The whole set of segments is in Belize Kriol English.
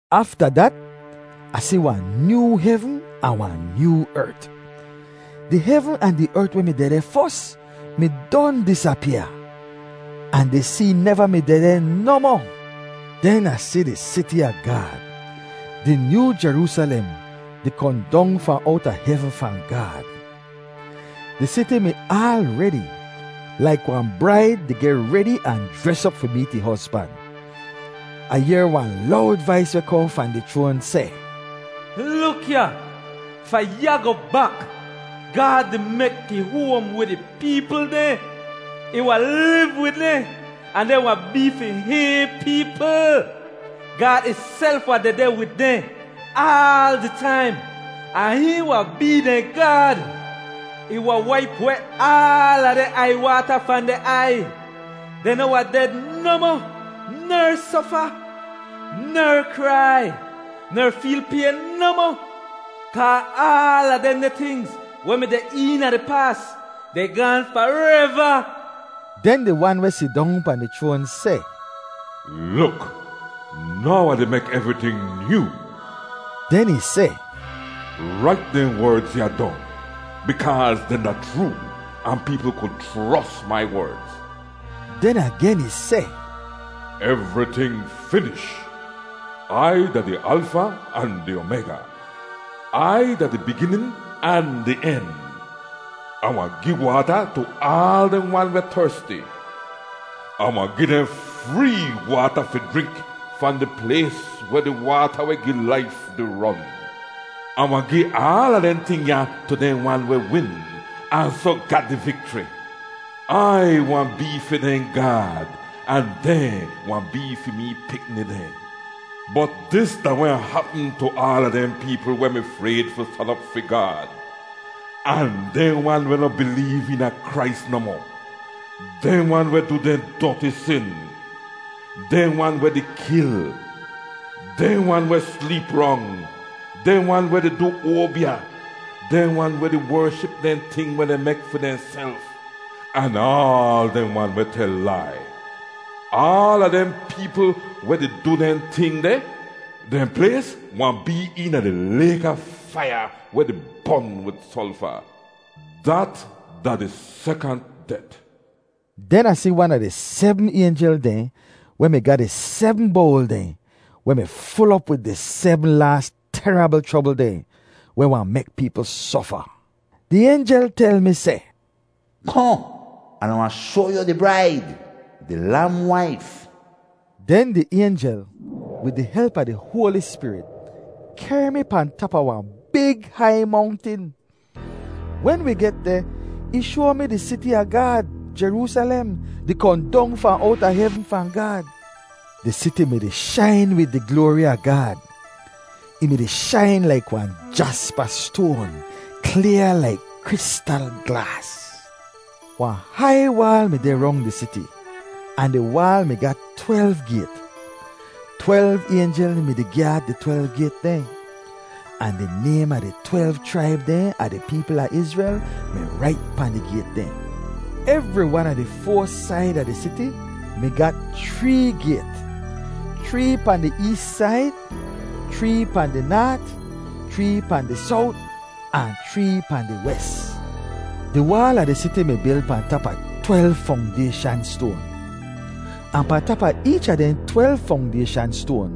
Afta dat, Ah si wahn nyoo hevn ahn wahn nyoo ert. Di hevn ahn di ert weh mi dehdeh fos mi don disapyaa. Ahn di see neva mi dehdeh nohmoh. Den Ah si di siti a Gaad, di nyoo Jeroosalem, di kohn dong fahn owta hevn fahn Gaad. Di siti mi aal redi, laik wahn braid di geh redi ahn jres op fi meet ih hozban. Ah yehr wahn lowd vais weh kohn fahn di chroan seh, “Luk ya! Fahn ya goh bak, Gaad di mek ih hoam wid ih peepl dehn! Ih wahn liv wid dehn ahn dehn wahn bee fi hihn peepl. Gaad ihself wahn dehdeh wid dehn aal di taim ahn hihn wahn bee dehn Gaad. Ih wahn waip weh aala dehn aiywaata fahn dehn aiy. Dehn noh wahn ded nohmoh ner sofa, ner krai ner feel payn nohmoh. Kaa aala dehndeh tingz weh mi deh eena di paas, dehn gaahn fareva.” Den di Wan weh sidong pahn di chroan seh, “Luk! Now Ah di mek evriting nyoo!” Den ih seh, “Rait dehn werdz ya dong, bikaaz dehn da chroo ahn peepl ku chros mai werdz.” Den agen ih seh, “Evriting finish! Ai da di Alfa ahn di Omayga. Ai da di biginin ahn di en. Ah wahn gi waata tu aal dehn wan weh tersti. Ah wahn gi dehn free waata fi jrink fahn di plays weh di waata weh gi laif di ron. Ah wahn gi aala dehn ting ya tu dehn wan weh win ahn soh ga di vikchri. Ai wahn bee fi dehn Gaad ahn dehn wahn bee fi mee pikni dehn. Bot dis da weh wahn hapm tu aala dehn peepl weh mi frayd fi stan op fi Gaad, ahn dehn wan weh noh bileev eena Krais nohmoh, dehn wan weh du dehn doti sin, dehn wan weh di kil, dehn wan weh sleep rong, dehn wan weh di du oabya, dehn wan weh di wership dehn ting weh dehn mek fi dehnself, ahn aal dehn wan weh tel lai. Aala dehn peepl weh di du dehn ting deh, dehn plays wahn bee eena di layk a faiya weh di bon wid solfa. Dat da di sekant det.” Den Ah si wan a di sebm aynjel dehn weh mi ga di sebm bowl dehn weh mi ful op wid di sebm laas terabl chrobl dehn weh wahn mek peepl sofa. Di aynjel tel mi seh, “Kohn, an Ah wahn shoa yu di braid, di Lam waif.” Den di aynjel, wid di help a di Hoali Spirit, kehr mi pahn tap a wahn big hai mongtin. Wen wi get deh, ih shoa mi di siti a Gaad, Jeroosalem, di kohn dong fahn owta hevn fahn Gaad. Di siti mi-di shain wid di gloari a Gaad. Ih mi-di shain laik wahn jaspa stoan, klyaa laik kristal glaas. Wahn hai waal mi deh rong di siti, ahn di waal mi ga twelv gayt. Twelv aynjel mi-di gyaad di twelv gayt dehn. Ahn di naym a di twelv chraib dehn a di peepl a Izrel mi rait pahn di gayt dehn. Evri wan a di foa said a di siti mi ga chree gayt: chree pahn di ees said, chree pahn di naat, chree pahn di sowt, ahn chree pahn di wes. Di waal a di siti mi bil pahn tap a twelv fongdayshan stoan. Ahn pahn tap a eech a dehn twelv fongdayshan stoan,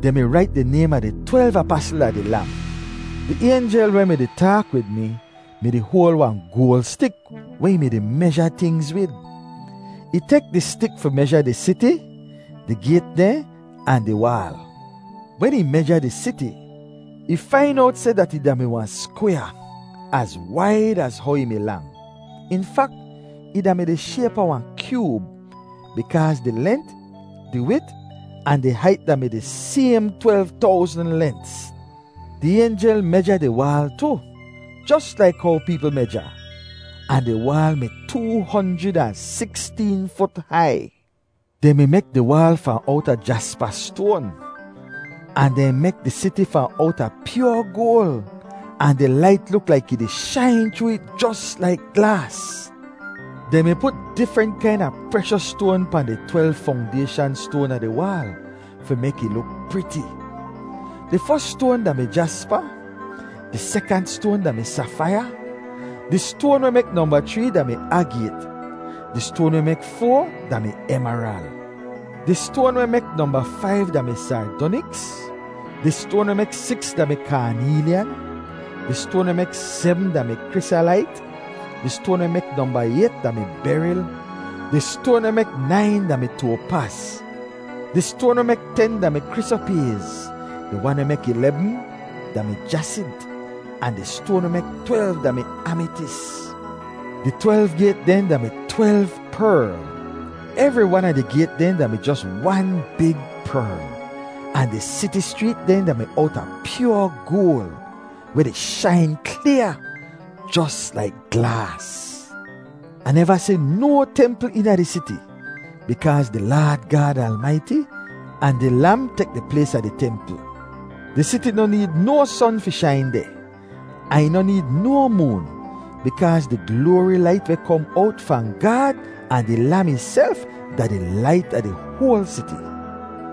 dehn mi rait di naym a di twelv apasl a di Lam. Di aynjel weh mi-di taak wid mi mi-di hoal wahn goal stik weh ih di meja tingz wid. Ih tek di stik fi meja di siti, di gayt dehn ahn di waal. Wen ih meja di siti, ih fain owt seh dat ih da-mi wahn skwyaa, az waid az how ih mi lang. In fak, ih da-mi di shayp a wahn kyoob, bikaaz di lent, di wit, ahn di hait da-mi di saym twelv towzn lents. Di aynjel meja di waal tu, jos laik how peepl meja. Ahn di waal mi too honjrid ahn siksteen fut hai. Dehn mi mek di waal fahn owta jaspa stoan, ahn dehn mek di siti fahn owta pyoa goal ahn di lait luk laik ih di shain chroo it jos laik glaas. Dehn mi put difrent kaina preshos stoan pahn di twelv fongdayshan stoan a di waal fi mek ih luk priti. Di fos stoan da-mi jaspa, di sekant stoan da-mi safaiya, di stoan weh mek nomba chree da-mi agayt, di stoan weh mek foa da-mi emeral. Di stoan weh mek nomba faiv da-mi sardoniks, di stoan weh mek siks da-mi kaaneelyan, di stoan weh mek sebm da-mi krisalait, di stoan weh mek nomba ayt da-mi beril, di stoan weh mek nain da-mi toapaz. Di stoan weh mek ten da-mi krisoprayz, di wan weh mek ilebm da-mi jasint, ahn di stoan weh mek twelv da-mi amitis. Di twelv gayt dehn da-mi twelv perl. Evri wan a di gayt dehn da-mi jos wan big perl. Ahn di siti schreet dehn da-mi owta pyoa goal, weh di shain klyaa, jos laik glaas. Ah neva si no templ eena di siti, bikaaz di Laad Gaad Almaiti, ahn di Lam tek di plays a di templ. Di siti noh need no son fi shain deh, ahn ih noh need no moon, bikaaz di gloari lait weh kom owt fahn Gaad ahn di Lam ihself da di lait a di hoal siti.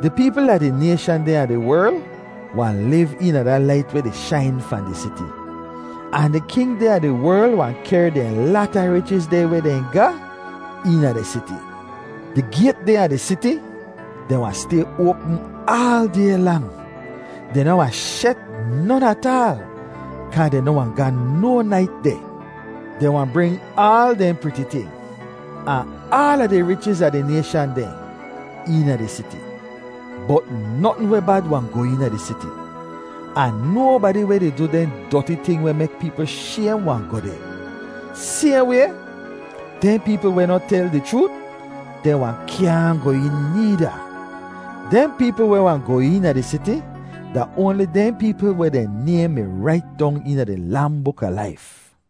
Di peepl a di nayshan dehn a di werl wahn liv eena da lait weh di shain fahn di siti. Ahn di king dehn a di werl wahn kehr dehn lata richiz dehn weh dehn ga eena di siti. Di gayt dehn a di siti, dehn wahn stay oapm aal day lang. Dehn noh wahn shet non ataal, kaa dehn noh wahn ga no nait deh. Dehn wahn bring aal dehn priti ting, ahn aala di richiz a di nayshan dehn, eena di siti. Bot notn weh bad wahn goh eena di siti. Ahn nobadi weh di du dehn doti ting weh mek peepl shaym wahn goh deh. Sayhn way, dehn peepl weh noh tel di chroot, dehn wahn kyaahn goh een needa. Dehn peepl weh wahn goh eena di siti da oanli dehn peepl weh dehn naym mi rait dong eena di Lam buk a laif.